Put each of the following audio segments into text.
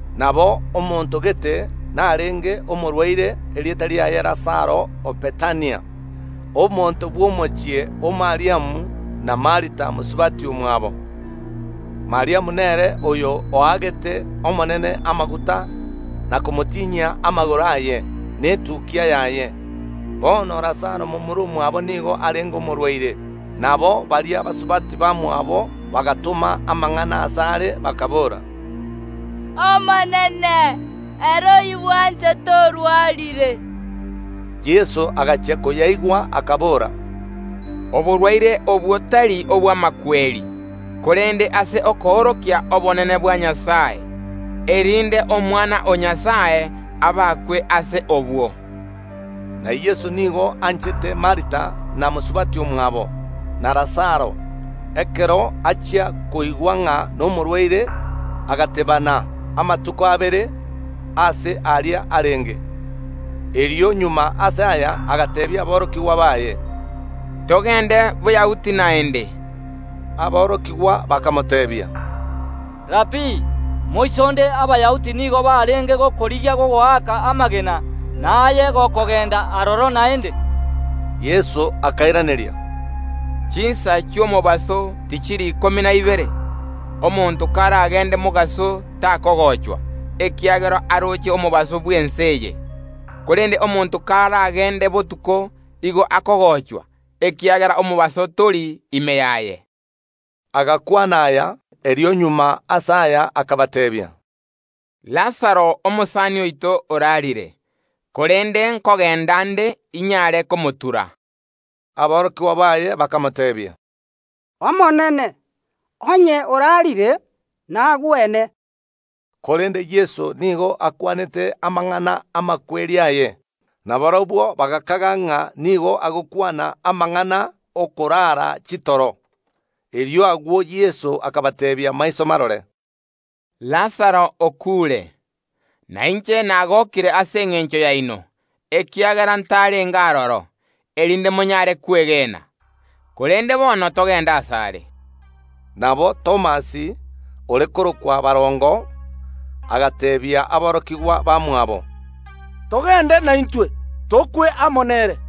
Nabo omonto gete narenge omorwaire, erieta riaye Lazaro o Bethania, omonto bw’omochie o Mariamu na Martha mosubati omwabo. Mariamu nere oyo oagete Omonene amaguta na komotinyia amagoro aye netukia yaye. Bono Lazaro momura omwabo nigo arenge omorwaire. Nabo baria basubati bamwabo bagatoma amang’ana asare, bakaboora, “Omonene, ere oyobwanchete orwarire.” Yeso agachia koyaigwa, akabora, “Oborwaire obwo tari obw’amakweri, korende ase okoorokia obonene bwa Nyasae, erinde Omwana o Nyasae abakwe ase obwo.” Na Yeso nigo anchete Martha, na mosubati omwabo, na Lazaro. Ekero achia koigwa ng’a nomorwaire, agateebana amatuko abere aria aase arenge. Erio magega ase aya agateebia aborokigwa baye, “Togende Boyahudi naende.” Aborokigwa bakamoteebia, “Rabii, moisonde Abayahudi nigo barenge gokorigia gokoaka amagena, na aye gokogenda aroro naende?” Yeso akairaneria, “Chinsa chi’omobaso tichiri ikomi na ibere? Omonto karagende mobaso takogochwa, ekiagera aroche omobaso bw’ense eye. Korende omonto karagende botuko, igo akogochwa, ekiagera omobaso tori ime yaye.” Agakwana aya; erio magega ase aya akabateebia, “Lazaro omosani oito orarire, korende nkogenda nde inyare komotura.” Aborokigwa baye bakamoteebia, “Omonene, onye orarire, nagwene.” Korende Yeso nigo akwanete amang’ana ’amakweri aye; na barabwo bagakaga ng’a nigo agokwana amang’ana y’okorara chitoro. Erio agwo Yeso akabateebia maiso marore, “Lazaro okuure. Na inche nagokire ase engencho yaino, ekiagera ntarenge aroro, erinde monyare kwegena. Korende bono togende asare.” Nabo Thomas, ore korokwa Barongo, agateebia aborokigwa bamwabo, “Togende naintwe, tokwe amo nere.”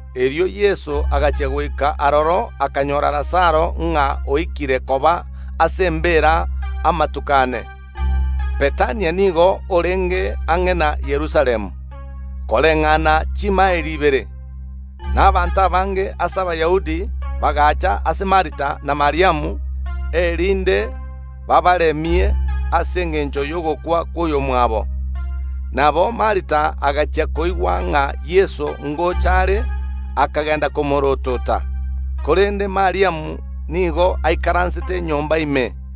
Erio Yeso agachia goika aroro akanyora Lazaro ng’a oikire koba ase embeera amatuko ane. Bethania nigo orenge ang’e na Yerusalemu, koreng’ana chimaeli ibere. Na abanto abange ase Abayahudi bagacha ase Martha na Mariamu, erinde baabaremie ase engencho y’ogokwa kw’oyomwabo. Nabo Martha agachia koigwa ng’a Yeso ngocha are, akagenda komoorotota, korende Mariamu nigo aikaransete nyomba ime.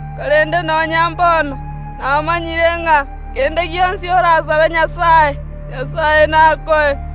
Korende nonya mbono namanyire ng’a kende gionsi orasabe Nyasae, Nyasae nakoe.”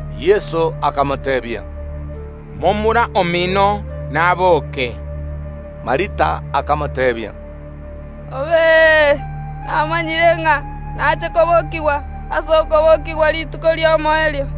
Yeso akamoteebia, “Momura omino naboke.” Martha akamoteebia, “Namanyire ng’a nache kobokigwa ase okobokigwa rituko ri’omoerio.”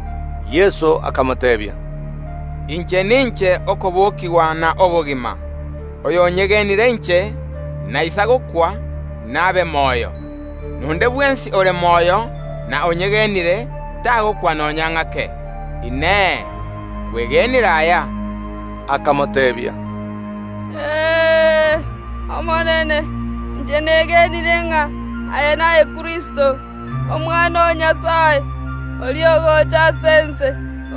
Yeso akamoteebia, “Inche ninche okobokigwa na obogima; oyonyegenire inche, naisa gokwa, nabe moyo. Na onde bwensi ore moyo na onyegenire, tagokwa nonya ng’ake. Inee! Kwegenire aya?” Akamoteebia, “Ee, Omonene; inche negenire ng’a aye naye Kristo, Omwana o Nyasae, oria ogocha ase ense.”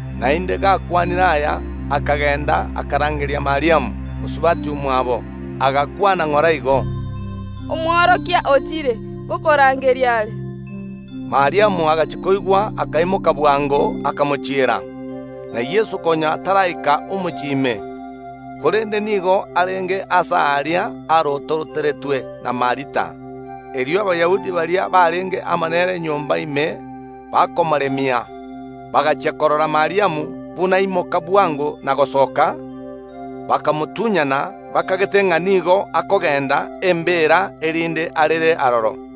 Naende gakwanire aya, akagenda, akarangeria Mariamu mosubati omwabo, agakwana ng’ora igo, “Omworokia ochire, ngokorangeria are.” Mariamu agachia koigwa, akaimoka bwango, akamochiera. Na Yeso konya taraika omochie ime, korende nigo arenge aase aria arototeretwe na Martha. Erio Abayahudi baria barenge amo nere nyomba ime bakomoremia, bagachia korora Mariamu buna aimoka bwango na gosoka, bakamotunyana, bakagete ng’a nigo akogenda embeera erinde arere aroro.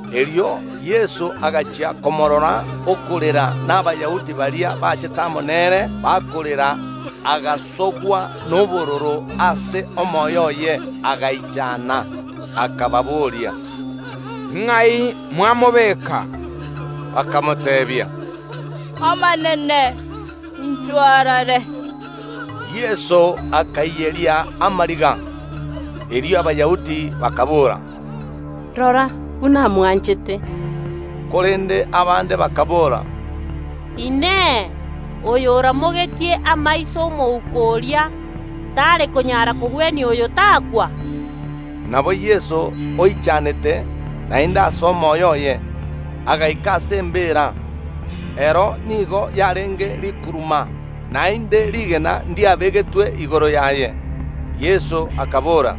Erio Yeso agachia komoorora okorera, na Abayahudi baria bachete amo nere bakorera; agasogwa nobororo ase omoyo oye, agaichana. Akababoria, “Ng’ai mwamobeka?” Bakamoteebia, “Omonene, inchwo orore!” Yeso akaiyeria amariga. Erio Abayahudi bakaboora, “Rora buna amwanchete.” Korende abande bakaboora, “Inee! Oyo oramogetie amaiso ’omouko oria, tare konyara kogwenia oyo takwa?” Nabo Yeso oichanete naende ase omoyo oye, agaika ase embeera. Ero nigo yarenge rikuruma, naende rigena ndiabegetwe igoro yaye. Yeso akabora,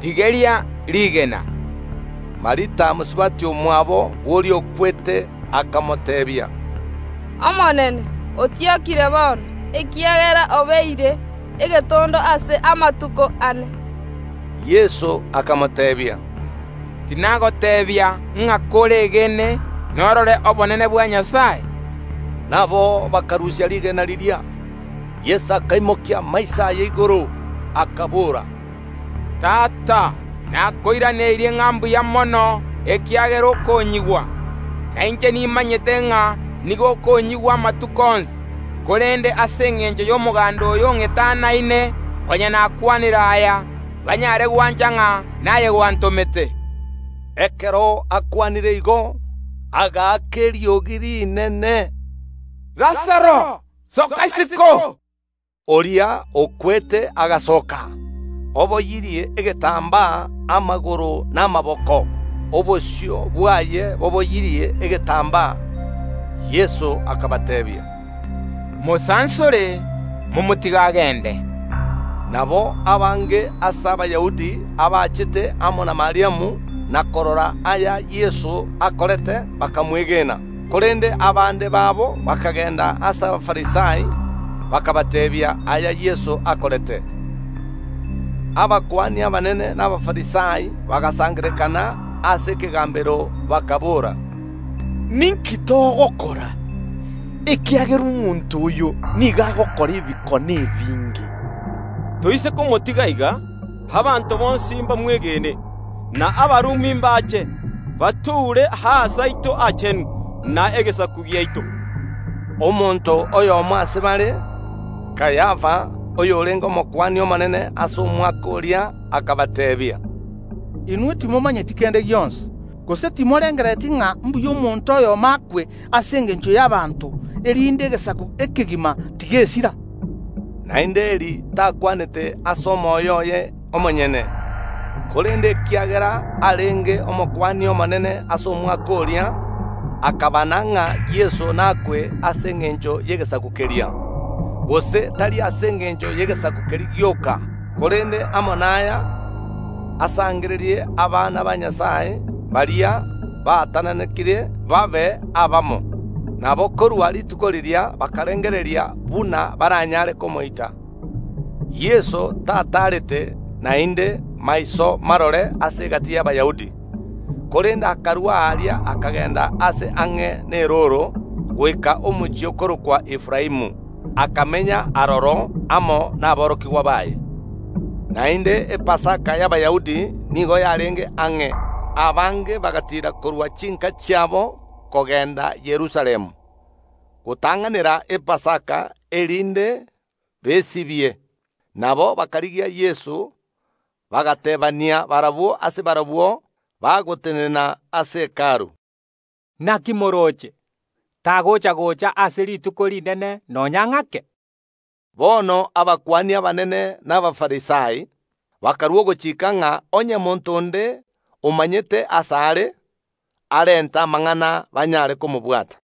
“Tigeria rigena.” Martha, mosubati omwabo bw’oria okwete, akamoteebia, “Omonene, otiokire bono, ekiagera obeire egetondo ase amatuko ane.” Yeso akamoteebia, “Tinagoteebia ng’a koregene norore obonene bwa Nyasae?” Nabo bakarusia rigena riria. Yeso akaimokia amaiso aye igoro, akabora, “Tata, nakoiraneria ng’a mbuya mono, ekiagera okonyigwa. Na inche nimanyete ng’a nigo okonyigwa amatuko onsi; korende ase engencho y’omoganda oyo ong’etanaine konya nakwanire aya, banyare gwancha ng’a naye gwantomete.” Ekero akwanire igo, agaaka eriogi rinene, “Lazaro, soka isiko!” Oria okwete agasoka, oboyirie egetambaa amagoro na amaboko; obosio bwaye boboyirie egetambaa. Yeso akabateebia, “Mosansore, momotige agende.” Nabo abange ase Abayahudi abachete amo na Mariamu na korora aya Yeso akorete, bakamwegena. Korende abande babo bakagenda ase Abafarisai, bakabateebia aya Yeso akorete. Abakuani abanene na Abafarisai bagasangererekana ase ekegambero, bakaboora, “Ninki togokora? Ekiagera omonto oyo nigo agokora ebikone ebinge. Toise komotiga iga, abanto bonsi mbamwegene; na Abarumi mbache, batoure Aase aito Aachenu na egesaku giaito.” Omonto oyomo ase bare, Kayafa, oyorenge Omokuani omonene ase omwaka oria, akabateebia, “Inwe timomanyeti kende gionsi. Gose timorengerereti ng’a mbuya omonto oyomo akwe ase engencho y’abanto, erinde egesaku ekegima tigesira.” Naende eri takwanete ase omoyo oye omonyene, korende ekiagera arenge Omokuani omonene ase omwaka oria, akabana ng’a Yeso nakwe ase engencho y’egesaku keria; gose tari ase engencho y’egesaku keria gioka, korende amo naya asangererie abana ba Nyasae baria baatananekire, babe abamo. Nabo korwa rituko riria bakarengereria buna baranyare komoita. Yeso tataarete naende maiso marore ase egati y’Abayahudi, korende akarua aria akagenda aase ang’e nerooro, goika omochie okorokwa Efraimu; akamenya aroro amo naborokigwa baye. Naende Epasaka y’Abayahudi nigo yarenge ang’e; abange bagatiira korwa chinka chiabo kogenda Yerusalemu gotang’anera Epasaka, erinde besibie. Nabo bakarigia Yeso, bagateebania barabwo ase barabwo, bagotenena ase Hekalu, “Naki morooche? Tagocha‐gocha ase rituko rinene nonya ng’ake?” Bono abakuani abanene na Abafarisai bakarua ogochika ng’a onye monto onde omanyete aase are, arente amang’ana, banyare komobwata.